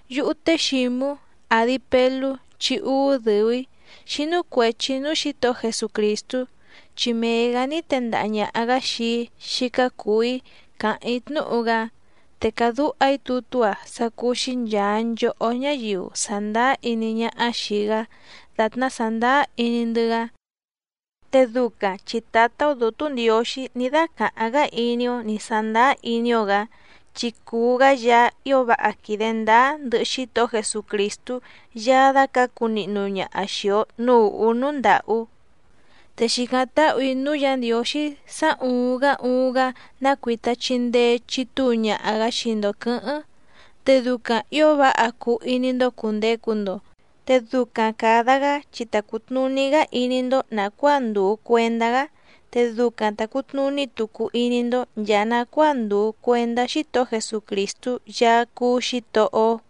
Yúhú té Xǐmú, àdi Pelú chi úú dɨ̀u‑í, xínú cuèchi núú Xǐtohó Jesucrìstú, chi mee‑gǎ ní tendaha ñàha‑gá xii‑í xícá cùu‑í càháⁿ‑í tnúhu‑gá. Te càdúha‑í tutú‑a sá cúú‑xí nchàa nchohó ñáyiu sàndáá iní ñáhá xìi‑gá dàtná sàndáá iní‑ndɨ́‑gá, te ducaⁿ chi Tǎtá‑ó Dǔtú Ndiǒxí ní dácàháⁿ‑gá iní‑ó nǐ sándáá iní‑ó‑gǎ, chi cùu‑gá Yaá ío váha quìde ndáá ndɨhɨ Xítohó Jesucrìstú Yaá dácǎcu nihnu ñaha xìi‑o núú ùhú núú ndàhú. Te xìcáⁿ táhù‑í núú Yǎ Ndiǒxí sá ùuⁿ‑gá uuⁿ‑gá ná cuìta chindee chitúu ñaha‑gǎ xii‑ndo quɨ̌hɨ́ⁿ, te ducaⁿ ǐo váha cuu iní‑ndó cùndecu‑ndo, te ducaⁿ càda‑gá chi ta cùtnuní‑gá iní‑ndó nàcuáa ndùu cuendá‑gá, te ducaⁿ ta cùtnuní tucu iní‑ndó nchàa nacuáa ndùu cuendá Xítohó Jesucrìstú Yaá cúú Xǐtohó‑ó.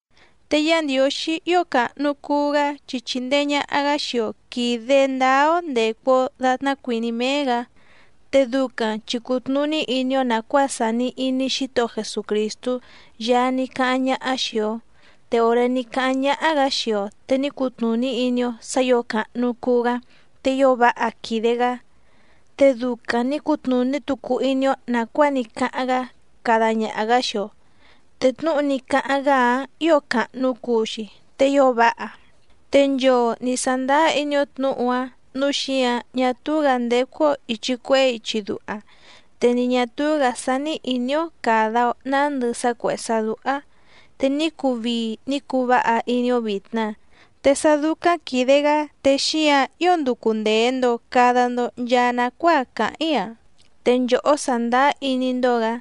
Te Yá Ndiǒxí ío càhnu cuu‑gá chi chìndee ñaha‑gá xii‑o quìde ndáá‑ó ndècu‑o datná cuìní méé‑gǎ, te ducaⁿ chi cùtnuní iní‑ó nàcuáa sàni iní Xítohó Jesucrìstú Yaá ní cáháⁿ ñáhá xìi‑o. Te òré ní cáháⁿ ñáhá‑gǎ xii‑o te ní cutnùní iní‑ó sǎ ǐo càhnu cuu‑gá te ío váha quìde‑gá. Te ducaⁿ nǐ cutnùní tucu iní‑ó nàcuáa ní cáháⁿ‑gá cada ñaha‑gǎ xii‑o, te tnúhu ní cáháⁿ‑gá‑áⁿ ǐo càhnu cuu‑xi te ío váha, te nchoo nǐ sándáá iní‑ó tnǔhu‑áⁿ nǔu xíǎⁿ ñá túú‑gǎ ndécú‑ó ìchi cuehé ichi duha te ni ñà túú‑gǎ sání ìní‑ó càda‑o nándɨ sá cuèhé sá dúhá, te ní cuu vii ní cuu váha iní‑ó vìtna. Te sá dúcáⁿ quìde‑gá te xíǎⁿ ío nducu ndèe‑ndo cada‑ndo nchaa nacuáa càháⁿ‑í‑a, te nchòhó sàndáá iní‑ndó‑gǎ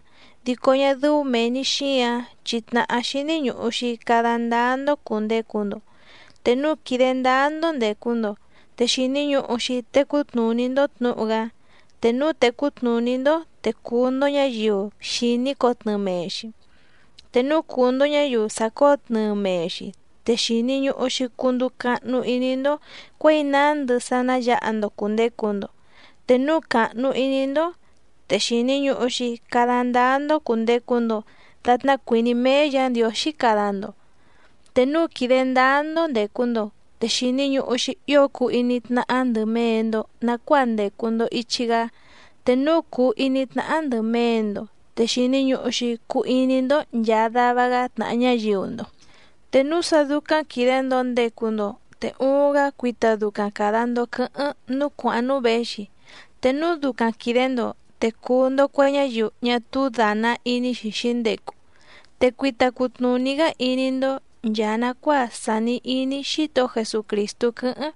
dico ñá dɨ́ú mèe‑ni xíǎⁿ chi tnàhá xíní ñùhu‑xi cada ndáá‑ndó cùndecu‑ndo. Te núu quìde ndáá‑ndó ndècu‑ndo te xìni ñuhu‑xi tecú tnùní‑ndó tnǔhu‑gá. Te núu tècú tnùní‑ndó te cùu‑ndo ñáyiu xìní cotnɨɨ mee‑xi, te núu cùu‑ndo ñáyiu sàcóo tnɨɨ mee‑xi te xìni ñuhu‑xi cunduu cahnu iní‑ndó cuěi nándɨ sá ná yǎha‑ndo cùndecu‑ndo, te núu càhnu iní‑ndó te xìni ñuhu‑xi cada ndáá‑ndó cùndecu‑ndo datná cuìní méé Yǎ Ndiǒxí cada‑ndo. Te núu quìde ndáá‑ndó ndècu‑ndo, te xìni ñuhu‑xi ío cuu iní tnáhá ndɨ̀ mee‑ndo nacuáa ndècu‑ndo ichi‑gá, te núu cùu iní tnáhá ndɨ̀ mee‑ndo te xìni ñuhu‑xi cuu iní‑ndó nchàa dava‑gá tnàha ñáyiu‑ndo. Te núu sa ducaⁿ quìde‑ndo ndecu‑ndo te uuⁿ‑gá cuita ducaⁿ càda‑ndo quɨ́hɨ́ⁿ núú cuàháⁿ núú věxi, te núu ducaⁿ quìde‑ndo te cùu‑ndo cue ñáyiu ñá túú dàna iní‑xi xǐndecu, te cuita cutnùní‑gá iní‑ndó nchàa nacuáa sàni iní Xítohó Jesucrìstú quɨ́hɨ́ⁿ.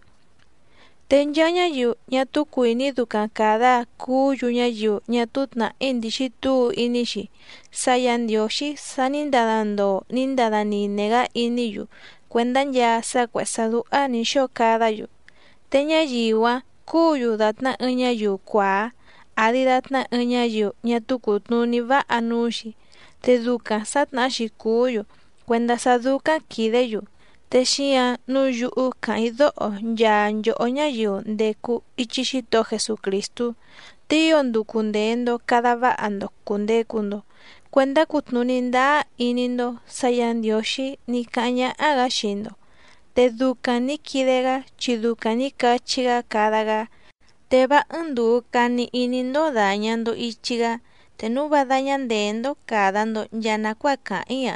Te nchaa ñáyiu ñá túú cuìní ducaⁿ càda cuú‑yu ñáyiu ñá túú tnàhí ndìxi túu iní‑xi sá Yǎ Ndiǒxí sa ní ndada ndoo ní ndada nine‑gá iní‑yu cuèndá nchaa sá cuèhé sá dúhá nǐ xóo cadá‑yu, te ñáyiu‑áⁿ cúǔ‑yu dàtná ɨɨⁿ ñáyiu cuàá àdi datná ɨɨⁿ ñáyiu ñá túú cùtnuní váha núú‑xi, te ducaⁿ sǎtnahá‑xi cùú‑yu cuèndá sá dúcáⁿ quìdé‑yu. Te xíǎⁿ nǔu yúhú càháⁿ‑í dóho nchaa nchòhó ñáyiu ndècu ichi Xítohó Jesucrìstú, te ío nducu ndèe‑ndo cada váha‑ndo cùndecu‑ndo cuendá cutnùní ndáá iní‑ndó sǎ Yǎ Ndiǒxí ní cáháⁿ ñáhá‑gǎ xii‑ndo, te ducaⁿ nǐ quide‑gá chi ducaⁿ nǐ cachí‑gá cada‑gá. Te vá ɨ́ɨ́ⁿ ndùu cani iní‑ndó dàña‑ndo ichi‑gá, te núu vá dáñá ndèé‑ndó càda‑ndo nchaa nacuáa càháⁿ‑í‑a.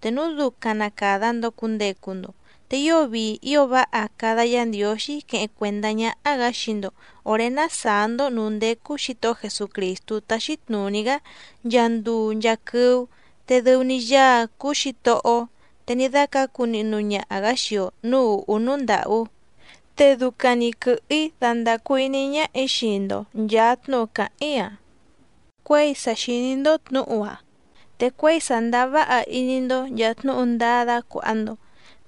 Te núu ducaⁿ na càda‑ndo cundecu‑ndo, te ío vii ío váha cada Yá Ndiǒxí queheⁿ cuèndá ñáhá‑gǎ xii‑ndo òré ná sàá‑ndó nǔú ndécú Xǐtohó Jesucrìstú táxí tnùní‑gá nchaa nduu nchaa quɨ́ú, te dɨu‑ni Yaá‑ǎⁿ cúú Xǐtohó‑ó te ní dácǎcu nihnu ñaha‑gǎ xii‑o nǔú ùhú núú ndàhú. Te ducaⁿ‑ni quɨ̀hɨ‑í dandàcu iní ñáhà‑í xii‑ndo nchàa tnúhu càháⁿ‑í‑a cuěi sa xìní‑ndó tnǔhu‑áⁿ, te cuěi sàndáá váha iní‑ndó nchàa tnúhu ndáá dácuàha‑ndo.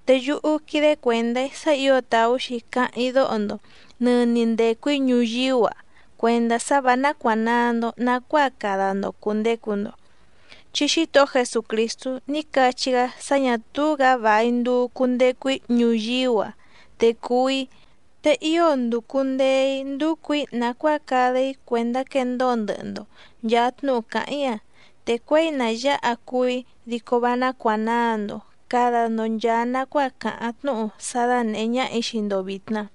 Te yúhú quídé cuèndá‑í sá ǐo tàú‑xi cáháⁿ‑í dóho‑ndo nɨ̀ni ndecu‑í ñuyíú‑a cuèndá sá vǎ nácuànaa‑ndo nacuáa cada‑ndo cùndecu‑ndo. Chi Xítohó Jesucrìstú ní cachí‑gá sá ñà túú‑gǎ vài nduu cundecu‑í ñuyíú‑a te cuú‑í. Te ío nducu ndèe‑í nducu‑ǐ nàcuáa cada‑í cuèndá quendóo ndɨhɨ‑ndo nchàa tnúhu càháⁿ‑í‑a, te cuěi na yǎha cuú‑í dico vá nácuànaa‑ndo cada‑ndo nchaa nacuáa càháⁿ tnúhu sá dánèhé ñáhà‑í xii‑ndo vìtna.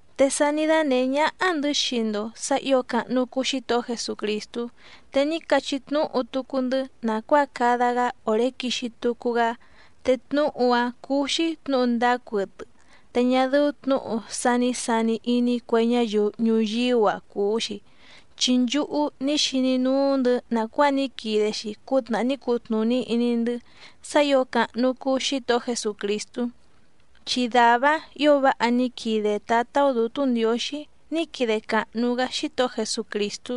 Te sa ní dánèhé ñáhá‑ndɨ̌ xii‑ndo sǎ ǐo càhnu cuu Xítohó Jesucrìstú. Te ní cachí tnúhu tucu‑ndɨ́ nàcuáa cada‑gá òré quixi tucu‑gá, te tnúhu‑áⁿ cúú‑xí tnǔhu ndáá cuɨtɨ te ñá dɨ́ú tnǔhu sá nǐ sani iní cue ñáyiu ñuyíú‑a cùu‑xi, chi nchúhú ní xiní núú‑ndɨ̌ nàcuáa ní quide‑xi cútnàhá ní cutnùní iní‑ndɨ́ sá ǐo càhnu cuu Xítohó Jesucrìstú. Chi dàvá‑áⁿ ǐo váha ní quide Tǎtá‑ó Dǔtú Ndiǒxí ní quide càhnu‑gá Xítohó Jesucrìstú,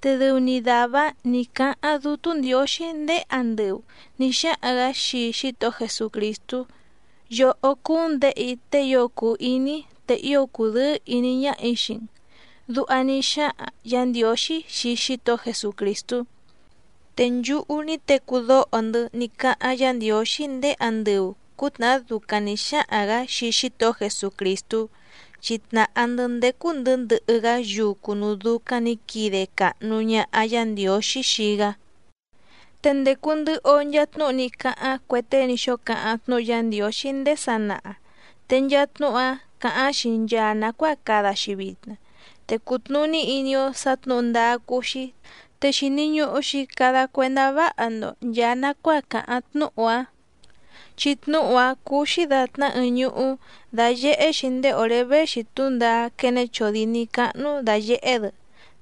te dɨu‑ni dàvá‑áⁿ nǐ cáháⁿ Dútú Ndiǒxí ndéé andɨu nǐ xáhaⁿ‑gǎ xii Xítohó Jesucrìstú: “Yòhó cúú‑n Děhe‑í tée ío cùu iní‑í, te ío cùdɨ́ɨ́ ìní ñáhà‑í xii‑n”, duha ní xáhaⁿ Yǎ Ndiǒxí xii Xítohó Jesucrìstú. Te nchúhú ní tecú dóho‑ndɨ́ ní cáháⁿ Yǎ Ndiǒxí ndéé andɨu cǔtnàhá ducaⁿ nǐ xáhaⁿ‑gǎ xii Xítohó Jesucrìstú, chi tnàhá‑ndɨ́ ndécú‑ndɨ̌ ndɨhɨ‑gá yucu núú dúcáⁿ nǐ quide càhnu ñaha Yá Ndiǒxí xii‑gá. Te ndècu ndɨhɨ‑o nchaa tnúhu ní cáháⁿ cue tée ní xóo cáháⁿ tnúhu Yá Ndiǒxí ndéé sanaha te nchaa tnúhu‑áⁿ càháⁿ‑xi nchaa nàcuáa cada‑xi vitna, te cùtnuní iní‑ó sǎ tnǔhu ndáá cúú‑xí, te xìni ñuhu‑xi cada cuendá váha‑ndo nchàa nacuáa càháⁿ tnúhu‑áⁿ, chi tnúhu‑áⁿ cúú‑xí dàtná ɨɨⁿ ñuhú dáyèhé‑xi ndéé òré véxi túndaá quéné chòdíní cáhnú dàyehé‑dɨ.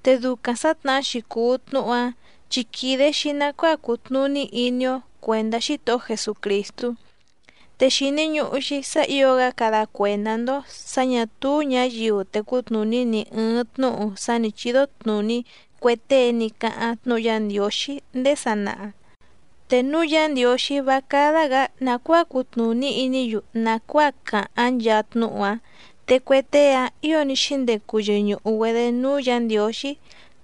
Te ducaⁿ sǎtnahá‑xi cùu tnúhu‑áⁿ chi quìde‑xi nacuáa cutnùní iní‑ó cuèndá Xítohó Jesucrìstú. Te xìni ñuhu‑xi sá ǐo‑gá cada cuèndá‑ndó sǎ ñà túú ñǎyiu tecú tnùní ni ɨ̀ɨⁿ tnúhu sá nǐ chídó tnùní cue tée ní cáháⁿ tnúhu Yá Ndiǒxí ndéé sanaha, te núu Yá Ndiǒxí vá cádá‑gǎ nàcuáa cutnùní iní‑yu nàcuáa càháⁿ nchaa tnúhu‑áⁿ. Te cue tée‑áⁿ ǐo ní xíndecu yɨñùhu‑güedé núú Yǎ Ndiǒxí,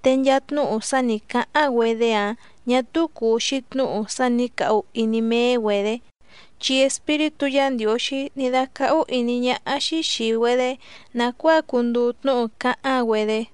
te nchaa tnúhu sá nǐ cáháⁿ‑güedé‑áⁿ ñà túú cùu‑xi tnúhu sá nǐ cahu iní méé‑güedě, chi Espíritú Yǎ Ndiǒxí ní dácáhú ìní ñáhá‑xí xìi‑güedé nàcuáa cunduu tnúhu cáháⁿ‑güedé.